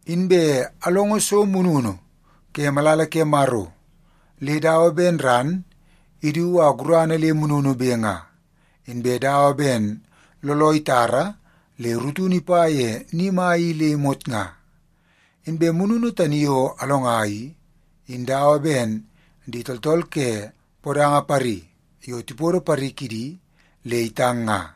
Inbe alongo so mununu ke malala ke Maro le dawa ben ran idu a gurana le mununube nga, inbe dawa ben looloo itara le rutunu ipa ye ni mai i le imot nga. Inbe mununu tani yo alonga i, in dawa ben di tooltool ke podanga pari yo tipodo pari kidi le itang nga.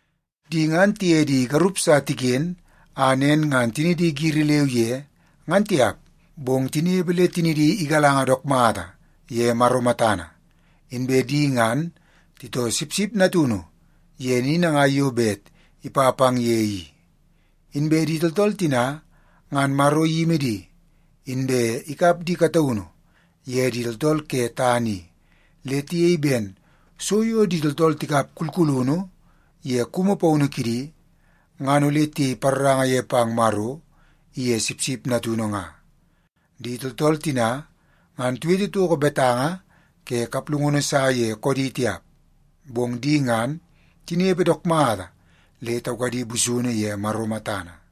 Di ngan tiye di garup sa tiken a nen ngan tinidi giri leu ye ngan tiap, bong tinepe le tinidi igalanga dook mata ye Maro matana. Inbe di ngan titoo Sipsip Natunu ye ni nangai yo bet ipa pang ye i. Inbe di tooltool tina ngan Maro iyimi di, inbe ikap di kataunu ye di tooltool ke tana i, le tiyei ben so yo di tooltool tikap kulkulunu ye kumu paunu kidi ngan ole tiyei paroranga ye pang Maro iye Sipsip Natunu nga. Di tooltool tina ngan tiwete toko betanga ke kaplungunu sa ye koodi tiap. Bong di ngan tinepe dook mata le taukadi busunu ye Maro matana.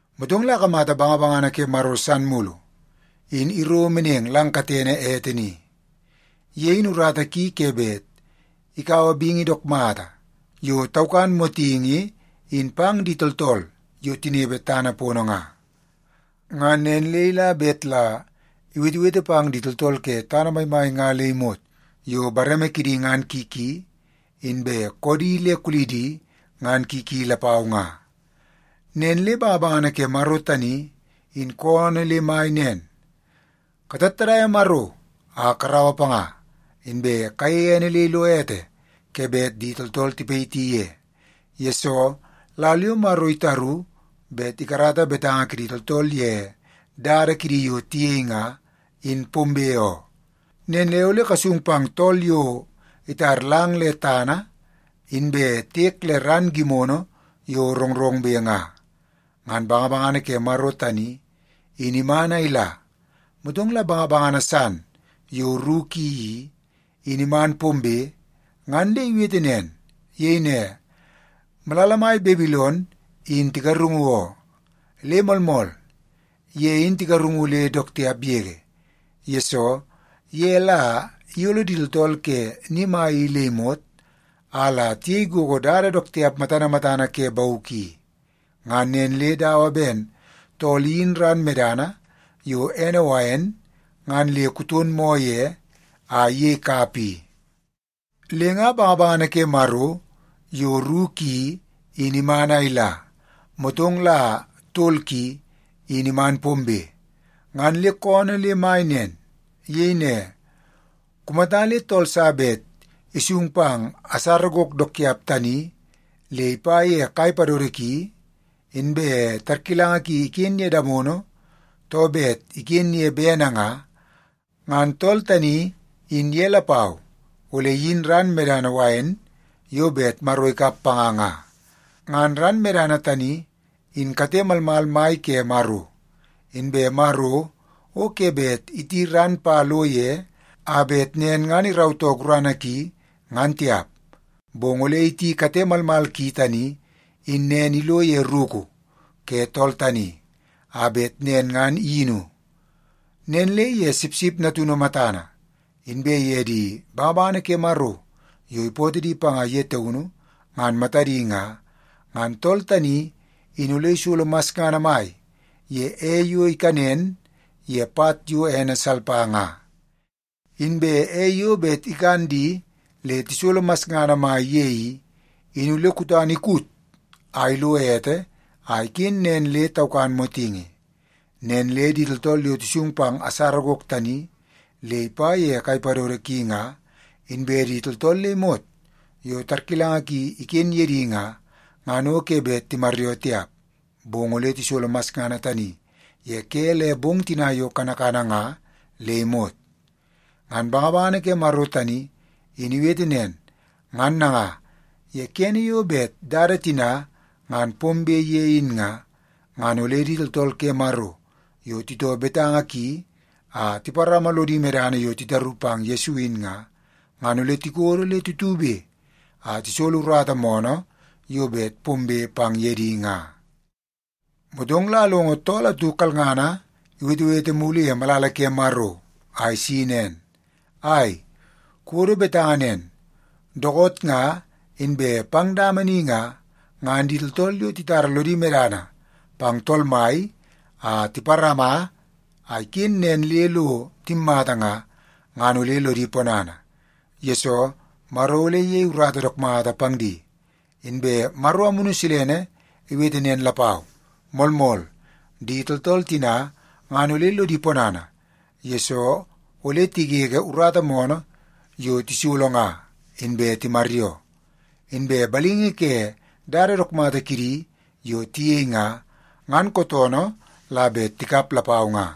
Motong la akamata bangabangana ke Maro san mulu, in iro meneng lang katene ete ni. Ye in urata ki ke bet ikaua bingi dook mata yo taukan motingi in pang di tooltool yo tinepe tana pono nga. Ngan nen le ila bet la iwetewete pang di tooltool ke tana maimai nga le imot yo bareme kidi ngan ki ki, inbe koodi le kulidi ngan ki ki lapau nga. Nen le bangabangana ke Maro tani in koonoo le mai nen, “Katattadaia Maro a karaua panga. Inbe kayeie ene le ilo ete ke bet di tooltool tipayiti ye, yesoo lal yo Maro itaru bet ikarata betanga kidi tooltool ye dada kidi yo tiyei nga, in pombe oo. Nen le ole kasung pang tool yo itar lang le tana inbe tiek le ran gimono yo rongrongbe nga.” Ngan bangabangana ke Maro tani in iman a ila, motong la bangabangana san yo ru ki i, in iman pombe ngan le iwete nen. Iyei ne, “Malala mai Babilon in tigarungu oo. Le moolmool, ye in tigarungu le dook tiap yege, yesoo ye la iyolo di tooltool ke ni mai i le imot, a la tiyei gogo dada dook tiap matana matana ke bauk i. Ngan nen le dawa ben tool iyin ran medana yo ene wain ngan le kuton moo ye a iyei kapa i.” Le nga bangabangana ke Maro yo ru ki in iman a ila, motong la tol ki, in iman pombe, ngan le koonoo le mai nen. Iyei ne, “Kumata le tool sa bet isung pang asara gok dook tiap tani le ipa ye kai padodo ki, inbe tarkilanga ki iken ye damono too bet iken ye bene nga, ngan tool tani in ye lapau ole iyin ran medana wain yo bet Maro ikap panga nga. Ngan ran medana tani in kate malmal mai ke Maro. Inbe Maro o ke bet iti ran pa lo ye a bet nen ngan irautoo gurana ki, ngan tiap. Bong ole iti kate malmal ki tani in nen ilo ye ruku ke tool tani, a bet nen ngan iyinu. Nen le ye Sipsip Natunu matana, inbe ye di bangabangana ke Maro yo ipootoo di panga ye taunu ngan matadi nga, ngan tool tani in ole isolo masngana mai ye ei yo ikanen ye pat yo ene salpa nga. Inbe ei yo bet ikan di le tisolo masngana mai ye i, in ole kutana ikut a ilo ete a iken nen le taukan motingi. Nen le di tooltool yo tisung pang asara gok tani le ipa ye kai padodo ki nga, inbe di tooltool le imot yo tarkilanga ki iken ye di nga, ngan o ke bet timaryoo tiap, bong ole tisolo masngana tani ye ke le bong tina yo kanakana nga le imot.” Ngan bangabangana ke Maro tani in iwete nen. Ngan nanga, ye kene yo bet dada tina ngan pombe ye in nga, ngan ole di tooltool ke Maro yo titoo betanga ki a tiparama lodi medana yo titaru pang Yesu in nga, ngan ole tikodo le tutube a tisolo urata moonoo yo bet pombe pang ye di nga. Motong la alongo tool atu kalngana iwetewete mulu ye malala ke Maro a isi nen, “Ai, kuwodo betanga nen. Dookoot nga inbe pang dama ni nga, ngan di tooltool yo titara lodi medana pang Tool Mai a tiparama a iken nen le lo timmata nga, ngan ole lodi ponana, yesoo Maro ole iyei urata dook mata pang di.” Inbe Maro Amunu Silene iwete nen lapau, “Moolmool. Di tooltool tina ngan ole lodi ponana, yesoo ole tigege urata moonoo yo tisolo nga inbe timaryoo. Inbe balingi ke dada dook mata kidi yo tiyei nga, ngan kootoonoo la bet tikap lapau nga.”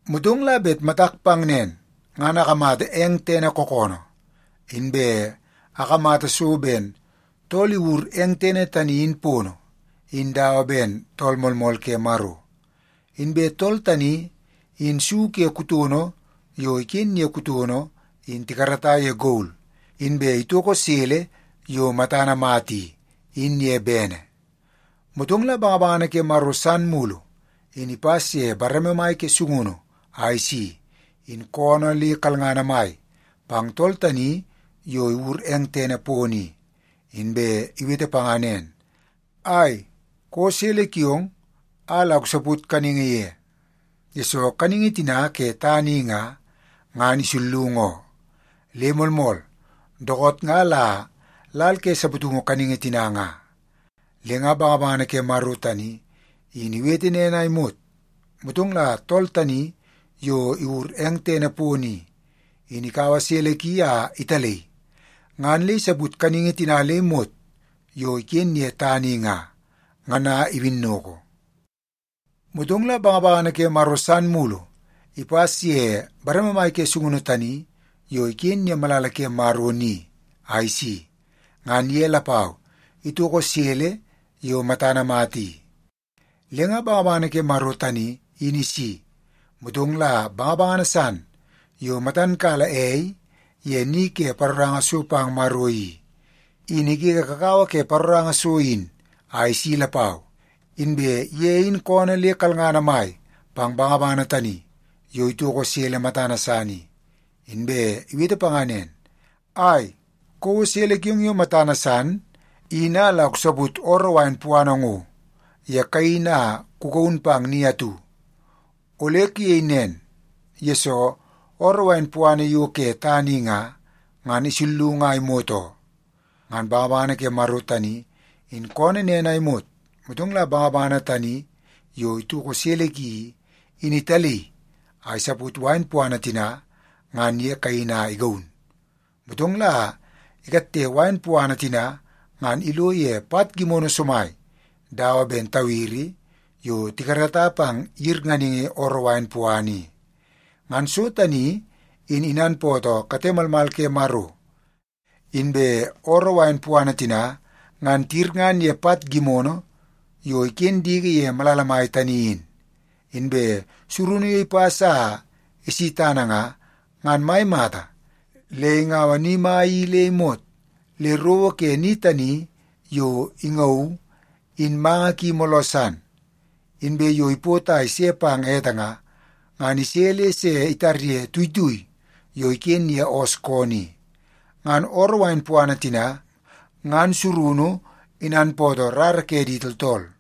Motong la bet matak pang nen, ngan akamata eng tene kookoonoo, inbe akamata so ben tool iwur eng tene tani in pono, in dawa ben Tool Moolmool Ke Maro. Inbe tool tani in su ke kutono yo iken ye kutono in tikarata ye gol, inbe itoko sele yo matana mata i, in ye bene. Motong la bangabangana ke Maro san mulu in ipas ye bareme mai ke sungunu a isi, in koonoo le kalngana mai pang tool tani yo iwur eng tene pono i. Inbe iwete panga nen, “Ai, kouo sele kiong a la kusaput kaningi ye, yesoo kaningi tina ke tana i nga, ngan isullungu oo. Le moolmool, dookoot nga la lal ke saputungu kaningi tina nga.” Le nga bangabangana ke Maro tani in iwete nen a imot, motong la tool tani yo iwur eng tene pono i, in ikaua sele ki a italaii ngan le isaput kaningi tina le imot yo iken ye tana i nga, ngan a iwinnoko. Motong la bangabangana ke Maro san mulu ipas ye bareme mai ke sungunu tani yo iken ye malala ke Maro ni a isi. Ngan ye lapau itoko sele yo matana mata i. Le nga bangabangana ke Maro tani in isi, motong la bangabangana san yo matan kala ei ye ni ke paroranga so pang Maro i, in igege kakawa ke paroranga so in a isi lapau. Inbe ye in koonoo le kalngana mai pang bangabangana tani yo itoko sele matana san i, inbe iwete panga nen, “Ai, kouo sele kiong yo matana san in a la kusaput ooroo wain puana ngo ye kaini a kugaun pang ni atu. Ole kuyei nen, yesoo ooroo wain puana yo ke tana i nga, ngan isullungu a imot oo.” Ngan bangabangana ke Maro tani in koonoo nen a imot, motong la bangabangana tani yo itoko sele ki i, in italaii a isaput wain puana tina ngan ye kaini a igaun. Motong la ikatte wain puana tina ngan ilo ye pat gimono somai dawa ben tawiri yo tikarata pang yirnganingi ooroo wain puana i. Ngan so tani in inanpootoo kate malmal ke Maro. Inbe ooroo wain puana tina ngan tiyirngan ye pat gimono yo iken diki ye malala mai tani in. Inbe surunu yo ipas a isi tana nga, ngan mai mata le ingaua ni mai i le imot le rowo ke ni tani yo ingauu in manga ki mooloo san. Inbe yo ipot a ise pang ete nga, ngan ise le se itarye tuitui yo iken ye oos koonoo i. Ngan ooroo wain puana tina ngan surunu inanpootoo rara ke di tooltool.